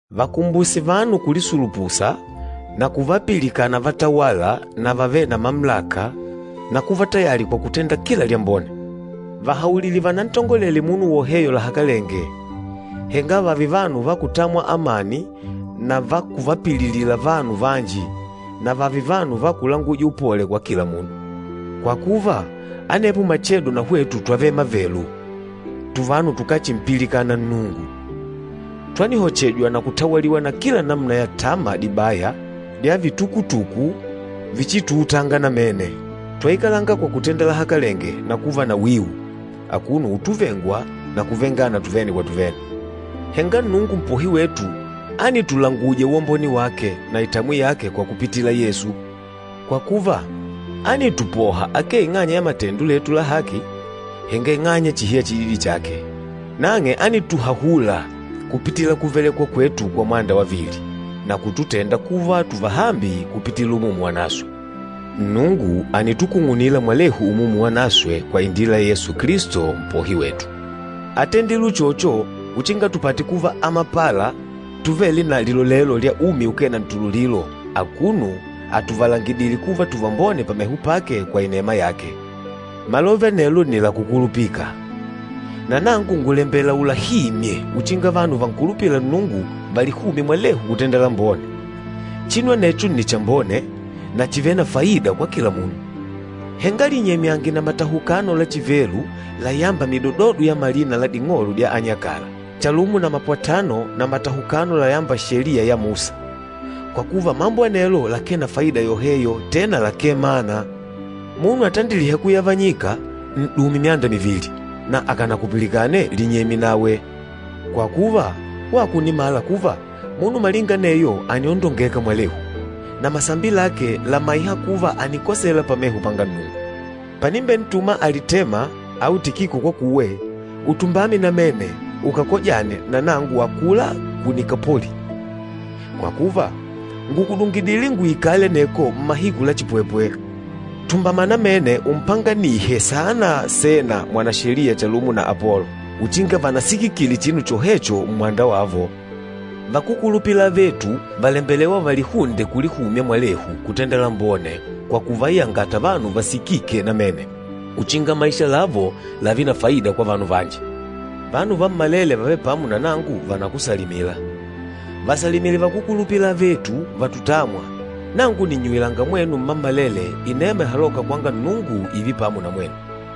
Vahimbuse vanu kulisulupusa na kuvapilikana vatawâla na vavêle na mamulaka na kuva tayali kwa kutenda kila lyambone. Vahaulile vanantongolele munu woheyo lahakalenge, henga vààve vanu va kutamwa amani na va kuvapililila vanu vanji na vààve vanu va kulanguja upole kwa kila munu. Kwa kuva, anepo machedo na hwetu twavele mavelu, tuvanu tukáchimpilikana Nnungu. Twanihochejwa na kutawaliwa na kila namuna ya tama dibaya dya vitukutuku vichituutanga namene. Twaikalanga kwa kutenda lahakalenge na kuva na wiu, akuno utuchimwa na kuchimana tuvene kwa tuvene. Henga Nnungu Mpohi wetu ánitulanguja uwambone wake na itamwi yake kwa kupitila Yesu. Kwa kuva, ánitupoha akee ing'anya ya matendo letu la haki, henga ing'anya chihi ya chididi chake. Nang'e ánituhahula kupitila kuvelekwa kwetu kwa mwanda wavili na kututenda kuva tuvahambi kupitila Umumu Wanaswe. Nnungu ànitukung'unila mwalehu Umumu Wanaswe kwa indila ya Yesu Kilisto, Mpohi wetu. Átendile uchocho uchinga tupate kuva amapala tuvêle na lilolelo lya umi ukee na ntululilo akuno atuvalangidìlè kuva tuvambone pameho pake kwa inema yake. Malove anelo nni la kukulupika. Na nangu ngùlembela ulahimye uchinga vanu vankulupîla Nnungu valihumye mwalehu kutenda lambone. Chinu anecho nni chambone, na chìvele na faida kwa kila munu. Henga linyemyange na matahukano la chivelu layâmba midododo ya malina la ding'olo dya anyakala, chalumo na mapwatano na matahukano layâmba Sheliya ya Musa, kwa kuva mambo anelo lakee na faida yoheyo tena lakee mana. Munu atandilîha kuyavanyika, n'dume myanda mivili, na akànakupilikane linyemye nawe. Kwa kuva, wako ùnimala kuva, munu malinga aneyo àniondongeka mwalehu, na masambi lake làmaiha kuva ànikosela pameho panga Nnungu. Panimbentuma Alitema au Tikiko kwakuwe, utumbame namene ukakojane na nangu akula ku Nikapoli, kwa kuva ngùkudungidile nguikale aneko mmahiku la chipwepwe. Tumbama namene umpanganihe saana Sena mwanasheliya chalumo na Apolo, uchinga vanasikikile chinu chohecho mmwanda wavo. Vakúkulupila avetu vàlembelewa valihunde kulihumya mwalehu kutenda lambone kwa kuvayangata vanu vasikike namene uchinga maisha lavo lààve na faida kwa vanu vanji. Vanu vammalele vavêle pamo na nangu vànakusalimila. Vasalimile vakúkulupila avetu, vatutâmwa. Nangu nìnnyuwilanga mwenu mmammalele inema ihalôka kwanga Nnungu, ììve pamo na mwenu.